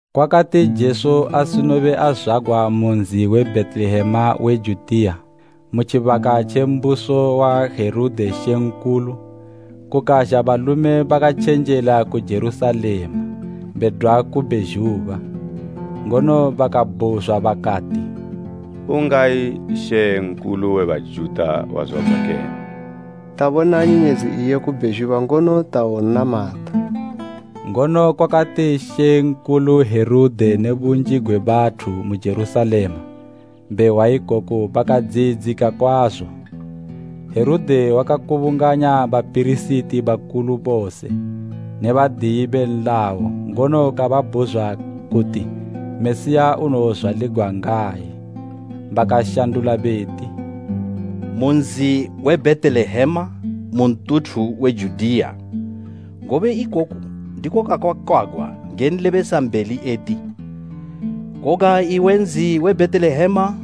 Kwakati Jesu asinobe azwagwa mu nzi we Bhetelehema we Judiya, mu tjibaka tje mbuso wa Herode mambo, kukazha balume bakatjenjela ku Jerusalema bedwa ku bhezhuba, ngono bakabhuzwa bakati, “Ungayi mambo we Bajuta wazwagwa kene? Tabona nyenyedzi iye ku bhezhuba ngono tawonnamata.” Ngono kwakati mambo Herode ne bunji gwe bathu mu Jerusalema, behwa ikoku bakadziyidzika kwazo. Herode wakakubunganya bapirisiti bakulu bose ne badiyi be nlayo ngono kababhuzwa kuti Mesiya unowozwaligwa ngayi. Bakashandula beti, “Mu nzi we Bhetelehema mu ntuthu we Judiya, ngobe ikoku ndiko kwakakwagwa nge nlebesambeli eti, “ ‘Koga iwe nzi we Bhetelehema,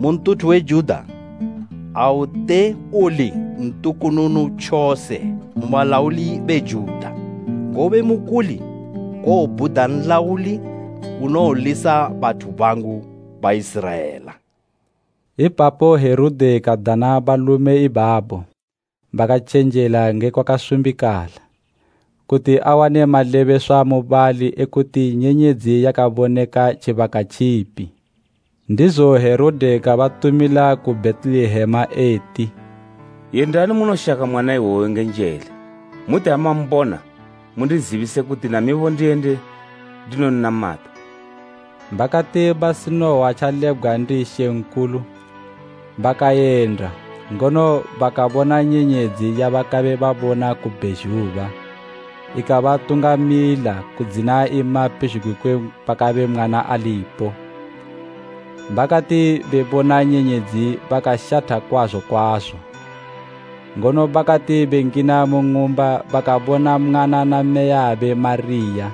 mu ntuthu we Juda, aute uli ntukununu tjose mu balauli be Juda, ngobe mukuli kowobhuda nlauli unowolisa bathu bangu Baiziraela.’” Ipapo Herode kadana balume ibabo bakatjenjela nge kwakasumbikala, kuti awane malebeswa mubali ekuti nyenyedzi yakaboneka tjibaka tjipi. Ndizo Herode kabatumila ku Bhetelehema eti, “Yendani munoshaka mwana iwoyo nge njele. Muti ha mambona, mundizibise kuti namibo ndiyende ndinonnamata.” Bakati basinohwa tjalebgwa ndi mambo, bakayenda, ngono bakabona nyenyedzi yabakabe babona ku bhezhuba, ikabatungamila kudzina ima pezhugwi kwe pakabe mwana alipo. Bakati bebona nyenyedzi bakashatha kwazo kwazo, ngono bakati bengina mu ng'umba bakabona mwana na mmeyabe Mariya,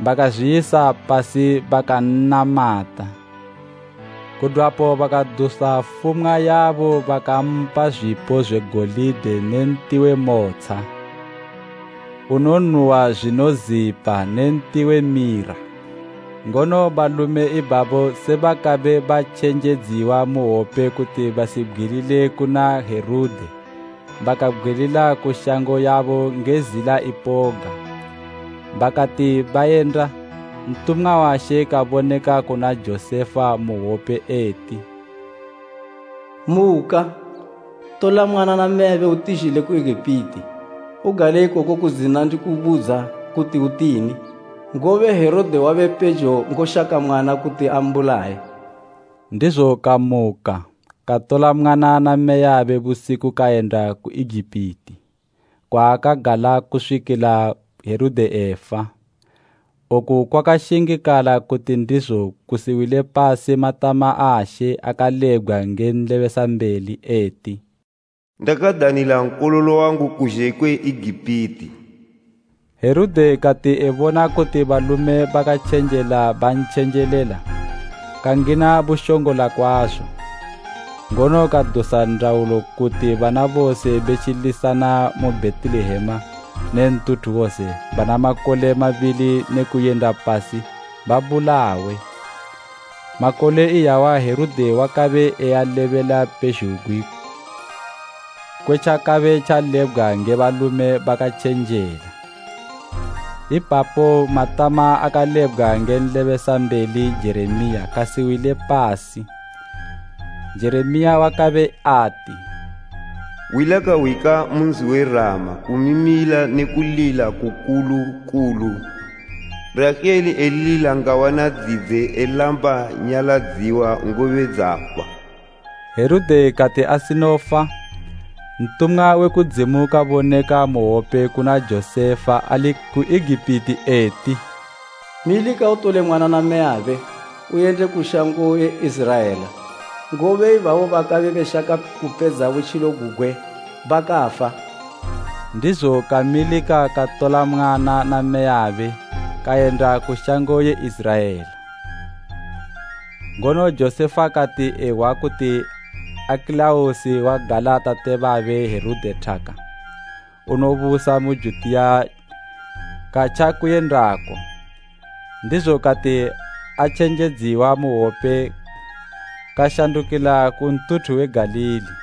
bakazwiyisa pasi bakan'namata. Kudwapo bakadusa fumwa yabo bakampa zwipo zwe golide ne nti we motsha unonuhwa zwinozipa ne nti we mira. Ngono balume ibabo se bakabe batjenjedziwa mu hwope kuti basibgwilile kuna Herode, bakabgwilila ku shango yabo nge zila ipoga. Bakati bayenda, ntumwa wa She kaboneka kuna Josefa mu hwope eti, “Muka, tola mwana na mmeyabe utizhile ku Egipiti. Ugale ikoko kudzina ndikubudza kuti utini, ngobe Herode wabe pejo ngoshaka mwana kuti ambulaye.” Ndizo kamuka, katola mwana na mmeyabe busiku kayenda ku Egipiti, kwaakagala kuswikila Herode efa. Oku kwakashingikala kuti ndizo kusiwile pasi matama a She akalebgwa nge nlebesambeli eti, “Ndakadanila Nkololo wangu kuzhe kwe Egipiti.” Herode kati ebona kuti balume bakatjenjela bantjenjelela, kangina bushongola kwazo, ngono kadusa ndaulo kuti bana bose be tjilisana mu Bhetelehema ne ntuthu wose bana makole mabili ne kuyenda pasi babulawe. Makole iyawa Herode wakabe ealebela pezhugwi kwe tjakabe tjalebgwa nge balume bakatjenjela. Ipapo matama akalebgwa nge nlebesambeli Jeremiya kasiwile pasi, Jeremiya wakabe ati, “Hwi lakahwika mu nzi we Rama kumimila ne kulila kukulu kulu Rahele elilila ngawana dzidze elamba nyaladziwa, ngobe dzafa.” Herode kati asinofa, ntumwa we kudzimu kaboneka mu hwope kuna Josefa ali ku Egipiti, eti, “Milika utole mwana na mmeyabe uyende ku shango ye Iziraela, ngobe ibabo bakabe beshaka kupedza butjilo gugwe bakafa.” Ndizo kamilika katola mwana na mmeyabe kayenda ku shango ye Iziraela. Ngono Josefa kati ehwa kuti Akelaosi wagala tate babe Herode thaka, unobusa mu Judiya katja kuyendako. Ndizo kati atjenjedziwa mu hwope kashandukila ku ntuthu we Galili.